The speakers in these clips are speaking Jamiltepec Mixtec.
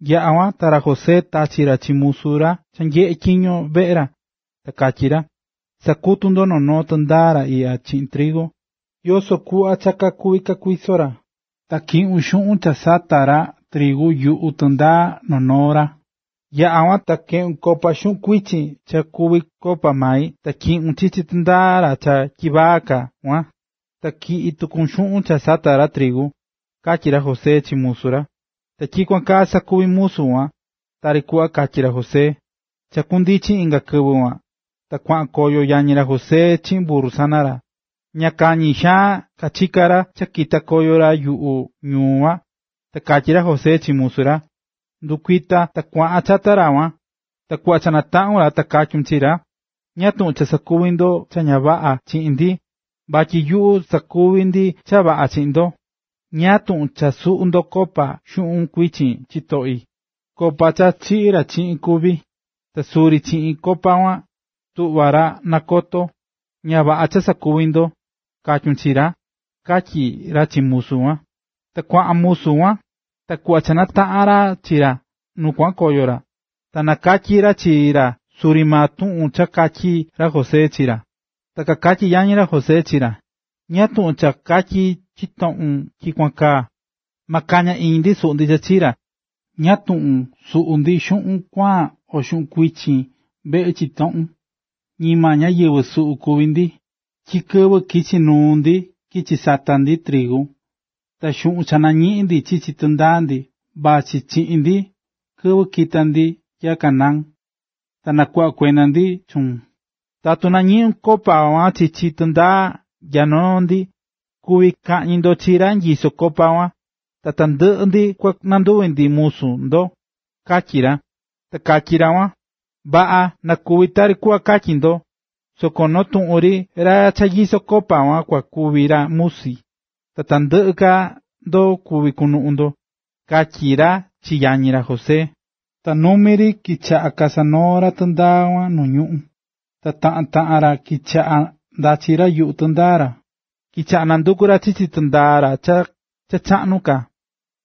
Yaꞌa̱ kuan, ta ra José tachi̱ ra chi musu cha nyeꞌé tyiño veꞌe ra, ta katyí ra: ―Sa̱kutu noo noo tɨndaa ra iꞌya chiꞌin trigu, yoso kuꞌva cha kakuví kakuiso ra, ta tyiꞌun xuꞌun cha kasata̱ ra trigu yuꞌu tɨndaa noo noo ra. Yaꞌa kuan, ta keꞌun copa xuꞌun kuichin cha kuví copa mai ta tyiꞌun chichi tɨndaa ra cha tyivaa ka kuan, ta tyiꞌi tuku xuꞌun cha sata̱ ra trigu ―katyí ra José chi musu ra. Ta tyikuan kaa sakuvi̱ musu kuan, tari kuꞌva katyí ra José. Cha kundichi inga kɨvɨ kuan, ta kuaꞌan koyo yañi ra José chiꞌin burru sana ra. Ña kañi xaan kachika̱ ra cha kita̱ koyo ra yuꞌu ñuu kuan, ta katyí ra José chi musu ra: ―Ndɨ̱kuita ta kua̱ꞌan chata ra kuan, ta kuꞌva cha nataꞌun chi ra, ta katyun chi ra: “¿Ñáá tuꞌun cha sakuvi ndo cha ña vaꞌa chiꞌin ndi, vatyi nyuꞌu sakuví ndi cha vaꞌa chiꞌin ndo? ¿Ñáá tuꞌun cha suꞌu̱ ndo copa xuꞌun kuichin chitoꞌi? Copa cha chiꞌí ra chiꞌin kuví, ta suri chiꞌin copa kuan tuꞌvá ra nakotó. ¡Ña vaꞌa maa cha sakuvi̱ ndo!”, katyun chi ra ―katyí ra chi musu kuan. Ta kuaꞌan musu kuan, ta kuꞌva cha nataꞌa̱n ra chi ra nu kuaꞌan koyo ra, ta nakatyí ra chi ra suri maa tuꞌun cha katyi̱ ra José chi ra. Ta kakatyí yañi ra José chi ra: ―¿Ñáá tuꞌun cha katyí chitoꞌun tyikuan kaa? ¡Ma kaña iñi ndi suꞌu ndi cha chii ra! ¿Ñáá tuꞌun suꞌu ndi xuꞌun kuaan o xuꞌun kuichin veꞌe chitoꞌun? Ñima ñáyɨvɨ suꞌu kuví ndi, tyi kɨvɨ kichi̱ nuu ndi kichi̱ sata̱ ndi trigu, ta xuꞌun cha nañiꞌi̱n ndi chichi tɨndaa ndi, vachí chiꞌin ndi kɨvɨ kita̱ ndi nya Canaán, ta nakuꞌva̱ kuenda ndi chuun. Tatu nañiꞌun copa kuan chichi tɨndaa nya noo ndi, kuví kaꞌñi ndo chi ra nyisó copa kuan, ta tandɨꞌɨ ndi kua nanduvi ndi musu ndo ―katyí ra. Ta katyí ra kuan: ―Vaꞌa, na kuvi tari kuꞌva katyi̱ ndo, soko noo tuꞌun ri ra cha nyisó copa kuan kua kuvi ra musi, ta tandɨꞌɨ ka ndo kuvi kunuꞌun ndo ―katyí ra chi yañi ra José. Ta numi ri kichaꞌa̱ kasanoó ra tɨndaa kuan nu ñuꞌún, ta taꞌan taꞌan ra kichaꞌa̱ ndachí ra yuꞌu tɨndaa ra. Kichaꞌa̱ nandukú ra chichi tɨndaa ra cha chaꞌnu ka kuan,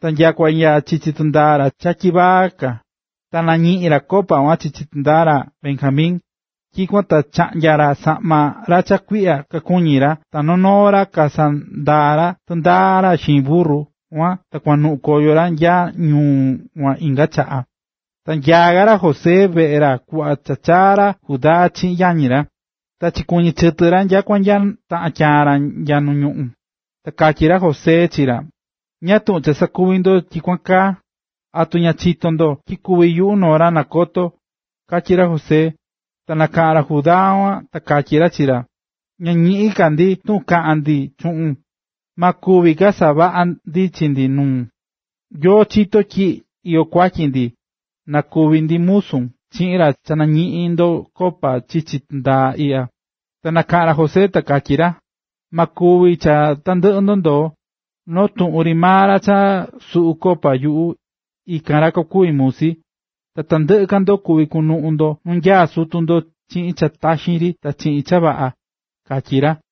ta nyakua nya chichi tɨndaa ra cha tyivaa ka, ta nañiꞌi̱n ra copa kuan chichi tɨndaa ra Benjamin. Tyikuan ta kachaꞌnya̱ ra saꞌma ra cha kuiꞌya kakuñi ra ta noo noo ra kasanandaa̱ ra tɨndaa ra xiin burru kuan ta kuanuꞌun koyo ra nyaá ñuu kuan inga chaꞌa. Ta nyaá ka ra José veꞌe ra kuꞌva cha chaa̱ ra Judá chiꞌin yañi ra, ta kachikuɨñɨ̱ chɨtɨ ra nyakua nya taꞌan tyaan ra nu ñuꞌún. Ta katyí ra José chi ra: ―¿Ñáá tuꞌun cha sakuvi̱ ndo tyikuan kaa? ¿Atu ña chitó ndo tyi kuví yuꞌu noo ra nakotó? ―katyí ra José. Ta nakaꞌa̱n ra Judá kuan ta katyí ra chi ra: ―Ña ñiꞌín ka ndi tuꞌun kaꞌan ndi chuꞌun. Ma kuvi ka savaꞌa ndi chi ndi nuun. Nyoo chito̱ ra tyi iyó kuatyi ndi, na kuvi maa ndi musun chiꞌin ra cha nañiꞌi̱n ndo copa chichi tɨndaa iꞌya. Ta nakaꞌa̱n ra José ta katyí ra: ―Ma kuvi cha tandɨꞌɨ ndo ndoo, noo tuꞌun ri maa ra cha suꞌu̱ copa yuꞌu, ikan ra kukuvi musi, ta tandɨꞌɨ ka ndo kuvi kunuꞌun ndo nu nyaá sutu ndo chiꞌin cha taxi ri ta chiꞌin cha vaꞌa ―katyí ra.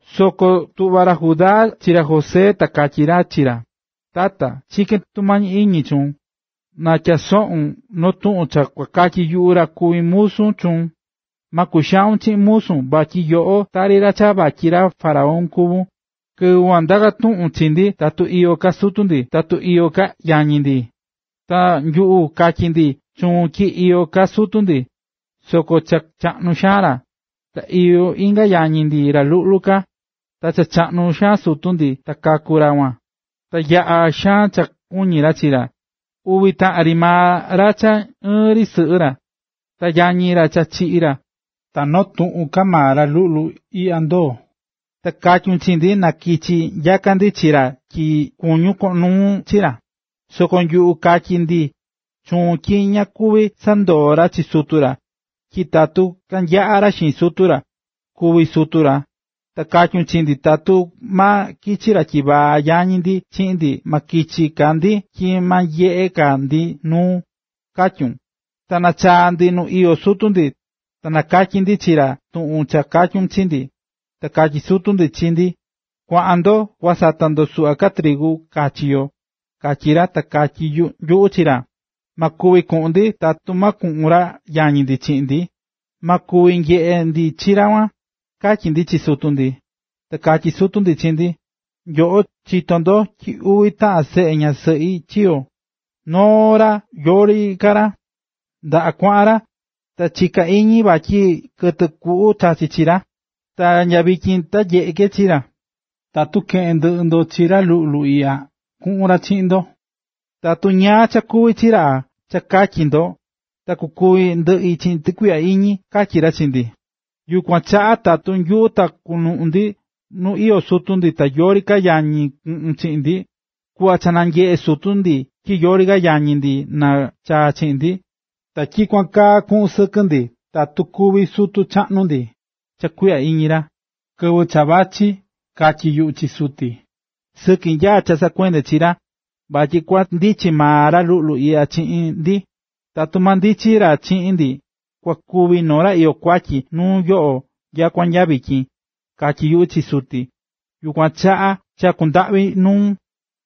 Soko tuꞌva̱ ra Judá chi ra José ta katyí ra chi ra: ―Tata, chikén tumañi iñi chuun, na tyasoꞌun noo tuꞌun cha kua katyi yuꞌu ra kuví musu chuun, ta ma kuxaun chiꞌin musun vatyi yoꞌo tari cha vatyi ra faraón kuvún. Kɨvɨ kuan ndaka̱ tuꞌun chi ndi tatu iyó ka sutu ndi, tatu iyó inga yañi ndi. Ta nyuꞌu katyí ndi chuun tyi iyó ka sutu ndi, soko cha chaꞌnu xaan ra, ta iyó inga yañi ndi ra luꞌlu ka, ta cha chaꞌnu sutu ndi ta kaku̱ ra kuan, ta yaꞌa̱ xaan cha kuñí ra chi ra. Uvi taꞌan ri maa ra cha ɨɨn ri sɨꞌɨ ra, ta yañi ra cha chiꞌi̱ ra, ta noo tuꞌun ka maa ra luꞌlu iꞌya ndoo̱. Ta katyu̱n chi ndi na kichi nyaka ndi chi ra tyi kuñún koꞌon nuun chi ra. Soko nyuꞌu katyi̱ ndi chuun tyi ña kuvi sandoo ra chi sutu ra, tyi tatu kanyaꞌa ra xiin sutu ra, kúvi sutu ra. Ta katyu̱n chi ndi tatu ma kichi ra tyivaa yañi ndi chiꞌin ndi ma kichi ka ndi tyi ma nyeꞌe ka ndi nuun, katyu̱n. ”Ta nachaa̱ ndi nu iyó sutu ndi, ta kanakatyi̱ ndi chi ra tuꞌun cha katyu̱n chi ndi. Ta katyí sutu ndi chi ndi: “Kua̱ꞌan ndo kua sata ndo suꞌva ka trigu kachi yo”, katyi̱ ra. Ta katyí nyuꞌu chi ra: ―Ma kuvi kuꞌun ndi, tatu ma kuꞌun ra yañi ndi chiꞌin ndi, ma kuvi nyeꞌe ndi chi ra kuan”, katyi̱ ndi chi sutu ndi. Ta katyí sutu ndi chi ndi: “Nyoꞌo chitó ndo tyi uvi taꞌan seꞌe ñasɨꞌi chiyo̱. Noo ra yori ka ra, ndaꞌa kuaꞌan ra, ta chiká iñi vatyi kɨtɨ kuꞌu chachi̱ tɨ chi ra. Ta nya vityin ta ña nyeꞌé ke chi ra. Tatu keꞌén ndɨꞌɨ ndo chi ra luꞌlu iꞌya, kuꞌun ra chiꞌin ndo, tatu ñáá cha kuvi chi ra, cha katyi ndo, ta kukúvi ndɨꞌi chiꞌin tɨkuiꞌya iñi”, katyí ra chi ndi. ”Yukuan chaꞌa tatu yuꞌu ta kunuꞌi nu iyó suti ta yori yañi kunuꞌun chiꞌin, kuꞌva cha nanyeꞌe suti tyi yori ra yañi na chaa chiꞌin ndi, ta tyikuan kaa kuꞌun sɨkɨ ndi tatu kúvi sutu chaꞌnu ndi cha kuiꞌya iñi ra. Kɨvɨ cha vachí, katyi̱ yuꞌu chi suti: “Sɨki nyaá cha saꞌakuendé chi ra, vatyi kua ndichi maa ra luꞌlu iꞌya chiꞌin ndi. Tatu ma ndichi ra chiꞌin ndi, kua kuvi noo ra iyó kuatyi nuu yoꞌo nyakua nya kúvi”, katyi̱ yuꞌu chi suti. Yukuan chaꞌa chakú ndaꞌvi nuun,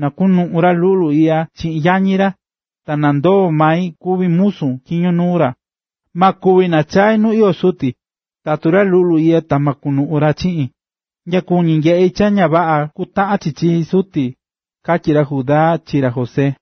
na kunuꞌun ra luꞌlu iꞌya chiꞌin yañi ra, ta na ndoo mai kuvi musun tyiño nuu ra. Ma kuvi nachai nu iyó suti, tatu ra luꞌlu iꞌya ta ma kunuꞌun ra chiꞌin. Ña kuñí nyeꞌi cha ña vaꞌa kutaꞌan chi chi suti ―katyí ra Judá chi ra José.